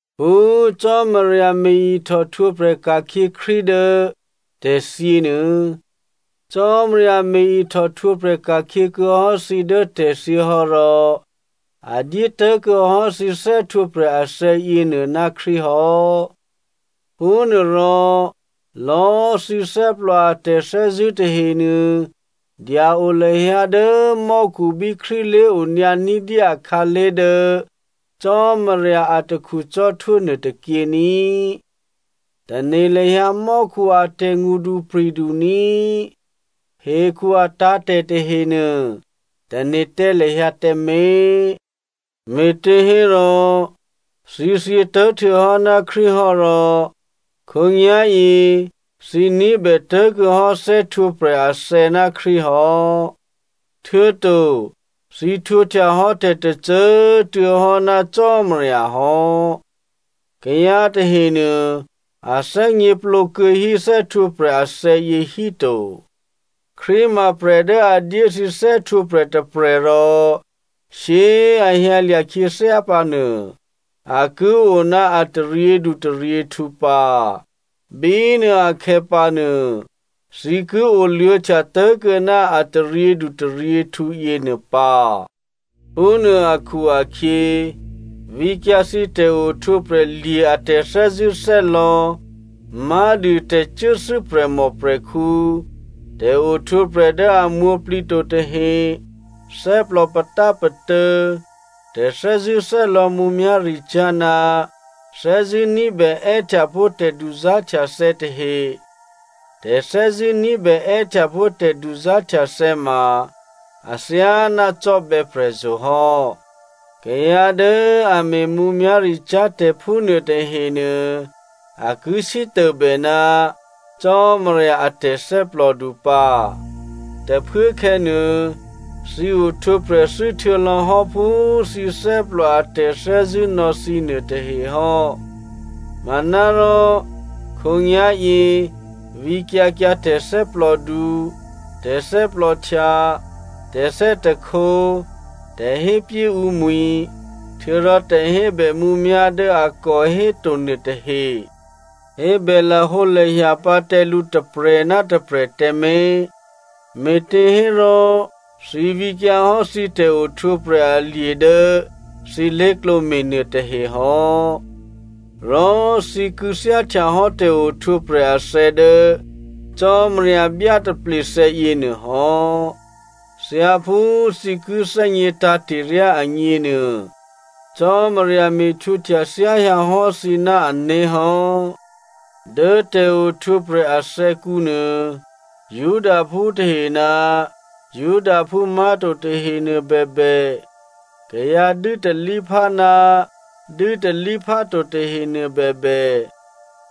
Phú Cò́marya me̤ ihtòhtwǒprè̤ ka̤khyě Krístu dố tè̤thyě nuô, Cò́marya me̤ ihtòhtwǒprè̤ ka̤khyě kuô̌hò́ thǐ dố tè̤thyě hò́ rò a dyé tố̤kuô̌ hò́ thǐ thè́htwǒprè̤ athè̌ yěnuô ná Krístu hò́. Phúnuôrò lò̌꤮ thǐ thè́plò a tè̤thè́zṳ̂́ tahenuô dya-o lahyǎ dố mò́khu bí Krístu lé̤onyǎ ní̤dyé akhǎlé̤ dố Cò́marya atakhu cò́htwó nuôtôkyě ní꤮. Tane̤ lahyǎ mò́khu a tè̤ngṳdupri̤du ní꤮. Hekhu atǎ̤tè̤ tahenuô, tane̤ tǎ lahyǎ tǎmé̤. Me̤těhérò, thǐ thyětố̤ htuô̌hò́ ná Krístu hò́ rò khǒnyá̤yě thǐ ní̤bè tố̤kuô̌hò́ thè́htwǒprè̤ athè̌ ná Krístu hò́, htuô̌to thǐ htwǒhtya hò́ tè̤tôcô꤮ tuô̌ hò́ ná Cò́marya hò́. Kayǎ tahenuô a thè́gněplǒ kuô̌hí thè́htwǒprè̤ athè̌yě híto. Krístu ma prè̤ dố a dyé thǐ thè́htwǒprè̤ tôprè̤ rò shyé꤮ a hyǎlya̤ khyěthyá pǎ nuô, a ki o ná a taryědutaryěhtǔ pǎ. Bínuô akhè̌pǎnuô, thǐ ki oluô̌htya tố̤kuô̌ ná a taryědutaryěhtǔ yěnuô pǎ. Phúnuô akhu-akhyě, vǐkyǎ thǐ tè̤ohtwǒprè̤ lye̤ a tè̤thè́zṳ̂́thè́lò̌ má̤dû, tè̤cuốthû́ prè̤mòprè̤khǔ, tè̤ohtwǒprè̤ dố a mwǒ̤plǐ to tahe, thè́plò patápatô̌, tè̤thè́zṳ̂́thè́lò̌ mǔmyá̤ricyá̤, ná thè́zṳ̂́ ní̤bè è́htya pó̤ tè̤duzá̤htyathè̌ tahe. Tè̤thè́zṳ̂́ní̤bè è́htyapó̤ tè̤duzá̤htyathè̌ ma athyáná cò́bè̌ prè̤zo̤ hò́. Kayǎ dố a me̤ mǔmyá̤ricyá̤ tè̤phúnuô tahenuô, a ki sítôbè ná Cò́marya a tè̤thè́plòdu pǎ. Tôphuốkhè̌nuô, thǐ ohtwǒprè̤ thû́ htuô̌lò̌ hò́ phú thǐ thè́plò a tè̤thè́zṳ̂́ nò̌ thǐ nuôtahe hò́. Manárò khǒnyá̤yě vǐkyǎ kyǎ tè̤thè́plòdu, tè̤thè́plòhtya, tè̤thè́hte, tè̤hépyé ǔmwi̤, htuô̌rò tè̤hébè mǔmyá̤ dố a kò héto nuôtahe. Hébè lahǒlahya pǎ tǎ lǔ tôprè̤ ná tôprè̤꤮ tǎmé̤, me̤těhérò thǐ vǐkyǎhò́ thǐ tè̤ohtwǒprè̤ alye̤ dố thǐ lé̤klǒ me̤nuô tahehò́. Rò thǐ kû̌thyáhtyahò́ tè̤ohtwǒprè̤ athè̌ dố Cò́marya byátaplethè̌ yěnuô hò́. Thyáphú thǐ ki thè́gně tǎ̤te̤ryá agněnuô, Cò́marya me̤htwǒhtya thyáhyǎ hò́ thǐ ná ané̤ hò́. Dố tè̤ohtwǒprè̤ athè̌kǔ nuô, Judaphú tahe ná Judaphú má̤to tahenuô bèbè, kayǎ dû́talíphá ná dû́talípháto tahenuô bèbè,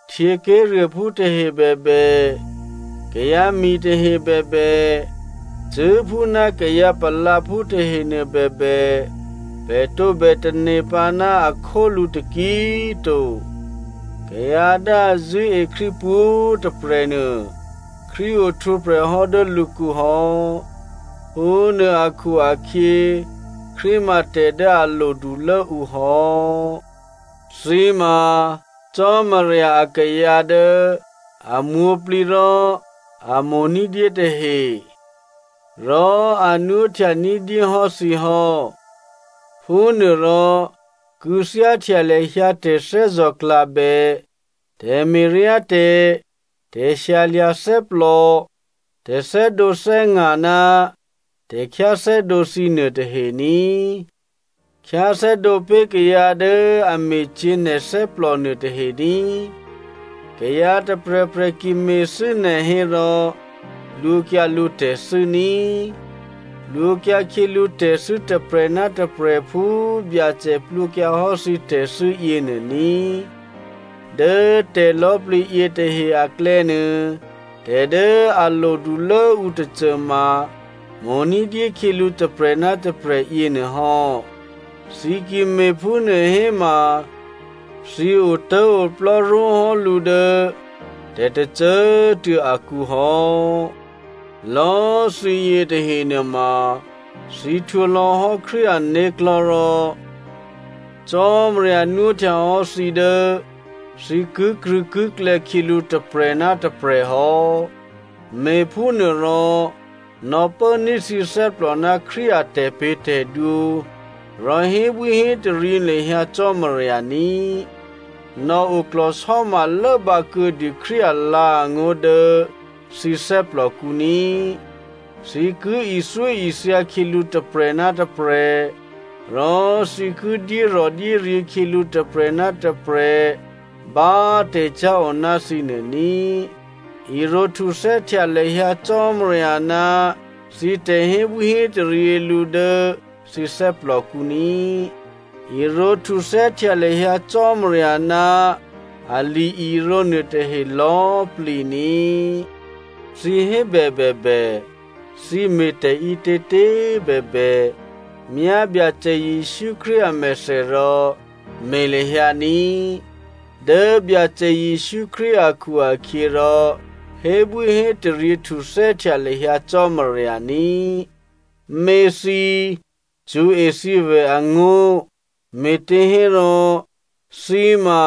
htyěké̤ruôphú tahe bèbè, kayǎmi̤ tahe bèbè, cṳ̂́phú ná kayǎ palǎphú tahenuô bèbè, pè̤ tǒbè tane̤ pǎ ná a khólǔ taki꤮ to. Kayǎ dố a zṳ̂́e Krístu pwǒ̤꤮ tôprè̤ nuô, Krístu ohtwǒprè̤ hò́ dố lǔkǔ hò́. Phúnuô akhu-akhyě, Krístu ma tè̤ dố a lodulố ǔ hò́. Thǐ ma Cò́marya akayǎ dố a mwǒ̤plǐ rò a mo̤ ní̤dyé tahe, rò a nwóhtya ní̤dyé hò́ thǐ hò́. Phúnuôrò kû̌thyáhtya lahyǎ tè̤thè́zò̤klabè, tè̤me̤ryátè̤, tè̤shyalya̤ thè́plò, tè̤thè́dǒthè́nga̤ ná tè̤khyáthè́dǒ thǐnuô tahe ní꤮. Khyáthè́dǒ pé̤ kayǎ dố a me̤cyě̤ nè̤ thè́plò nuôtahe ní꤮. Kayǎ tôprè̤prè̤ ki me̤thû́ nè̤ hérò plwǒkyǎ lǔtè̤thû́ ní꤮. Plwǒkyǎ khyělǔ tè̤thû́ tôprè̤ ná tôprè̤ phú Byacè plwǒkyǎhò́ thǐ tè̤thû́ yěnuô ní꤮. Dố tè̤lò̌꤮ plǐ yětahe aklè̌nuô, tè̤ dố a lodulốǔ tôcôma, mo̤ ní̤dyé khyělǔ tôprè̤ ná tôprè̤ yěnuôhò́. Thǐ ki me̤phúnuô héma, thǐ otố̤oplò́ ró̤hò́ lǔ dố tè̤tôcô꤮ tuô̌ akǔ hò́. Lò̌꤮ thǐyě tahe nuôma thǐ htwǒ lò̌hò́ Krístu ané̤klò̤́ rò Cò́marya nwóhtya hò́ thǐ dố thǐ kikrṳ̂̌kiklè̌ khyělǔ tôprè̤ ná tôprè̤ hò́. Me̤phúnuôrò nò̌pốní̤ thǐ thè́plò ná Krístu a tè̤pě̤tè̤dwǒ, rò hébwíhétaryě lahyǎ Cò́marya ní꤮. Nò̌ oklò̤sò́ma lốbǎ kuô̌dû Krístu alǎ̤angó̤ dố thǐ thè́plòkǔ ní꤮. Thǐ ki ithyóithya khyělǔ tôprè̤ ná tôprè̤, rò thǐ ki dyérò̤dyéryě̤ khyělǔ tôprè̤ ná tôprè̤ bá tè̤cyá̤ o ná thǐ nuô ní꤮. Irǒhtuthè́htya lahyǎ Cò́marya ná thǐ tè̤hébwíhétaryě lǔ dố thǐ thè́plòkǔ ní꤮. Irǒhtuthè́htya lahyǎ Cò́marya ná ali-irǒ nuôtahe lò̌꤮ plǐ ní꤮. Thǐ hébè bèbè, thǐ me̤tè̤ ǐtětě꤮ bèbè, myá Byacè Jesǔ Krístu amèthè rò me̤ lahyǎ ní꤮. Dố Byacè Jesǔ Krístu akhu-akhyěrò hébwíhétaryě htuthè́htya lahyǎ Cò́marya ní꤮. Měthǐ꤮ cṳ̌e thǐvè̤ angó̤, me̤těhérò thǐ ma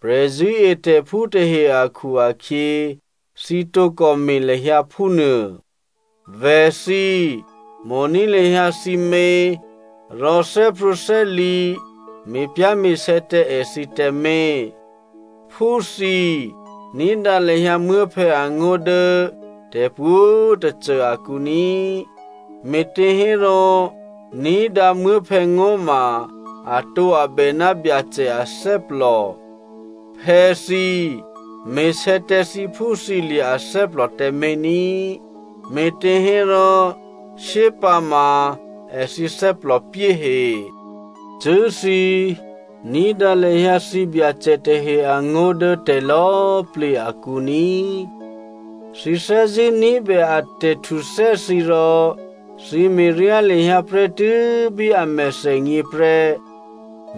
prè̤zṳ̂́etè̤phú tahe akhu-akhyě, thǐ tǒkò me̤ lahyǎ phúnuô. Vè̤thǐ꤮ mo̤ní̤ lahyǎ thǐmě rò thè́prwǒ̤thè́li̤, me̤pyá̤me̤sè̌ tǎ èthǐ tǎmé̤. Phúthǐ꤮ ní̤dǎ lahyǎ muố̤phè̌ angó̤ dố tè̤pwǒ̤꤮ tôcô akǔ ní꤮, me̤těhérò, ní̤dǎ muố̤phè̌ ngó̤ ma atǒabè ná Byacè athè́plò. Phè̌thǐ꤮ me̤sè̌ tǎ thǐphúthǐlye̤ athè́plò tǎmé̤ ní꤮, me̤těhérò shyépǎma èthǐ thè́plòpyé he. Cṳ̂́thǐ꤮ ní̤dǎ lahyǎ thǐbyacè tahe angó̤ dố tè̤lò̌꤮ plǐ akǔ ní꤮. Thǐ thè́zṳ̂́ ní̤bè a tè̤htuthè́ thǐ rò thǐ me̤ryá lahyǎ prè́tû́ bí a mèthènyě prè́.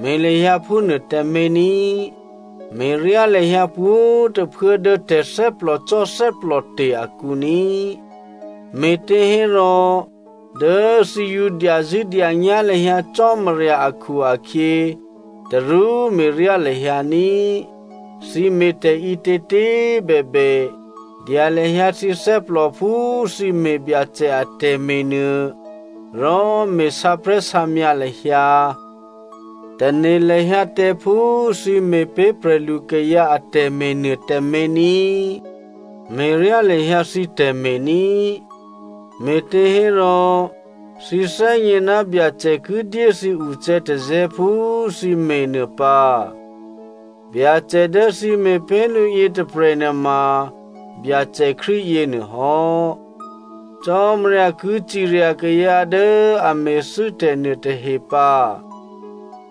Me̤ lahyǎ phúnuô tǎmé̤ ní꤮. Me̤ryá lahyǎ pwǒ̤꤮ tôphuố dố tè̤thè́plòcò́ thè́plòte̤ akǔ ní꤮. Me̤těhérò dố thǐ yǒ dyazṳ̂́dyanyá̤ lahyǎ Cò́marya akhu-akhyě, tarú me̤ryá lahyǎ ní꤮. Thǐ me̤ tè̤ǐtětě꤮ bèbè, dya lahyǎ thǐ thè́plò phú thǐ me̤ Byacè atè̤me̤ nuô, rò me̤ sǎprè̤́sǎmyǎ lahyǎ. Tane̤ lahyǎ tǎ phú thǐ me̤ pé̤ prè̤lukayǎ atè̤me̤ nuô tǎmé̤ ní꤮. Me̤ryá lahyǎ thǐ tè̤me̤ ní꤮, me̤těhérò thǐ thè́gně ná Byacè ki dyé thǐ ucè̌tazè̌ phú thǐ me̤nuô pǎ. Byacè dố thǐ me̤ pé̤ lǔ yětôprè̤ nuôma Byacè Krístu yěnuôhò́. Cò́marya ki cirya kayǎ dố a me̤thû́tè̤ nuôtahe pǎ.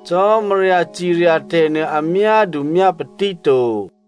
Cò́marya cirya tè̤nuô a myádu myápatí to.